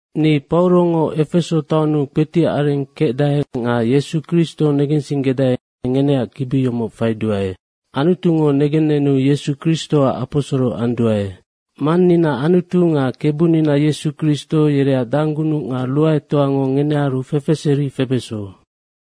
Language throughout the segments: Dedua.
Ni Paurongo Efeso taonnu kpetiac areng kecdae nga Yesu Kristo negensinggedae, ngeneac kibi yomoc faiduae. Anutungo negennenu Yesu Kristoac aposoro anduae. Mannina Anutu nga Kebunina Yesu Kristo yereac danggunuc nga ruaetoango ngenearu fefeseri febeso.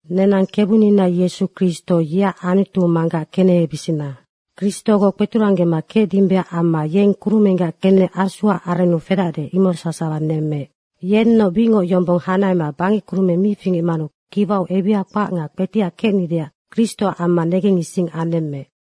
Nenang Kebunina Yesu Kristo, yeac Anutu Manggac kenehebisina. Kristogoc kpeturanggema kecdimbeac amma yeng kurumenggac kenec Asuac arennu fedacde, imoc sasawa nemmeec. Yennoc bicngoc yombong hanahema bangec kurumeng mi fingecmanu kiwau ebiha kpac nga kpetiac kecnideac Kristoac amma negengising anemmeec.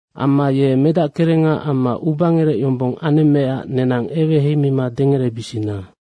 Amma ye Medackerengaac amma ubangerec yombong anemmeecac nenang eweheimima dengerebisina.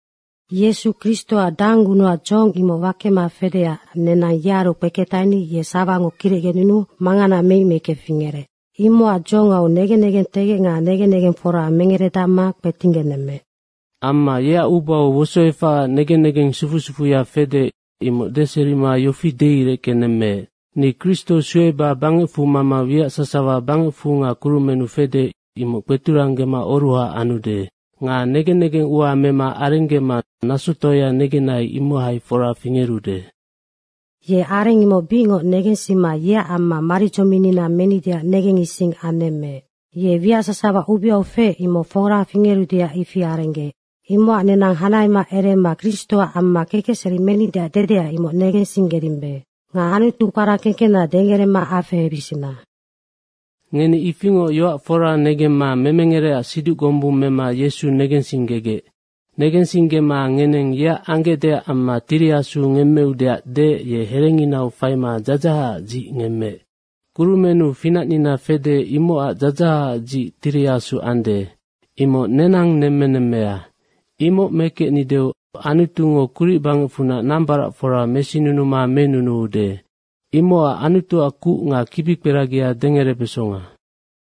Yesu Kristoac danggunucac dzohong imoc wakema fedeac nenang yearu kpeketaheni ye sawango kirecgenunuu mangana meic meicke fingerec. Imocac dzohongau negen negentegec nga negen negeng fora mengeredacma kpetinggenemmeec. Amma yeac ubau wosoefacac negen negeng sufu sufuya fede, imoc deserima yofi deireckenemmeec, “Ni Kristo sueba bangecfu mama wiac sasawa bangecfu nga kurumennu fede, imoc kpeturanggema oruha anude. Nga negen negeng ua mema arenggema nasotoaya negenai, imohai fora fingerude.” Ye areng imoc bicngoc negensima yeac amma maridzominnina menideac negengising anemmeec. Ye wiac sasawa ubeau feec, imoc fora fingerudeac ifi arenggeec. Imocac nenang hanahema erema Kristoac amma kekecseri menideac dedea, imoc negensinggedimbe. Nga Anutu kpara kengkena dengerema afehebisina. Ngeni ifingoc yoac fora negemma memengerecac siduc gombung mema Yesu negensinggegec. Negensinggema ngeneng yeac anggecdeac amma Tiri Asu ngemmeudeac deec, ye herenginau faima dzadzahacac dzic ngemmeec. Kurumennu finacnina fede, imocac dzadzahacac dzic Tiri Asu ande. Imoc nenang nemmenemmea. Imoc mekecnideu Anutungo kuric bangecfunac nambaracfora mesinunuma menunuude. Imocac Anutuac kuc nga kibikperagia dengerebesonga.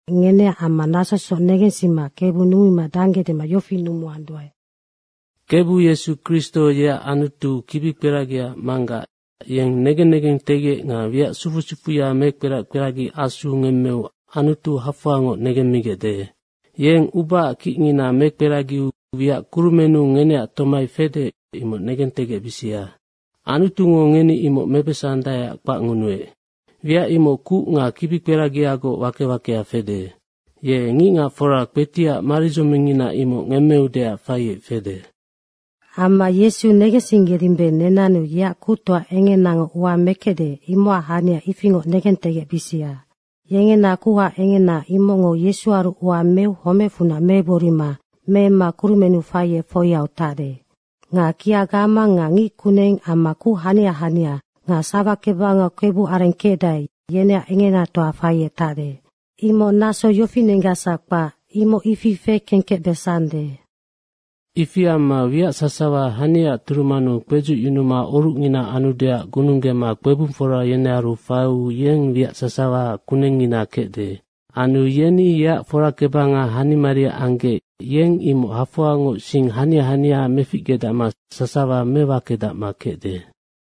ngeneac amma nasosoc negensima Kebu numumima dangge dema yofi numuanduae, Kebu Yesu Kristo yeac Anutu, kibikperagiaac Manggac, yeng negen negengtegec nga wiac sufu sufuya mekperac kperagi Asu ngemmeu Anutu hafoangoc negemmigecde. Yeng ubaac kicngina mekperagiu wiac kurumennu ngeneac tomai fede, imoc negentegecbisia. Anutungo ngeni imoc mebesandaeac kpacngunuec. Wiac imoc kuc nga kibikperagiagoc wake wakea fede. Ye ngicngacfora kpetiac maridzomingngina imoc ngemmeudeac faiec fede. Amma Yesu negensinggedimbe, nenannu yeac kuctoa engenango ua mekecde, imocac hania ifingoc negentegecbisia. Nga yengena kuha engena, imocngo Yesuaru ua meu homecfunac megborima meemma kurumennu faiec foiau tacde. Nga kia gamang nga ngickuneng amma kuc hania hania nga sawakebangau kebuareng kecdae, yeneac engenatoa faiec tacde, imoc naso yofinenggacsac kpac, imoc ifi fekengkecbesande. Ifi amma wiac sasawa haniaac turumannu kpedzucyunuma orucngina anudeac gununggema kpebungfora yenearu faiu yeng wiac sasawaac kunengngina kecde. Anu yeni yeac forakebanga hanimaria anggec yeng imoc hafoangoc sing hania hania meficgedacma sasawa mewakedacande.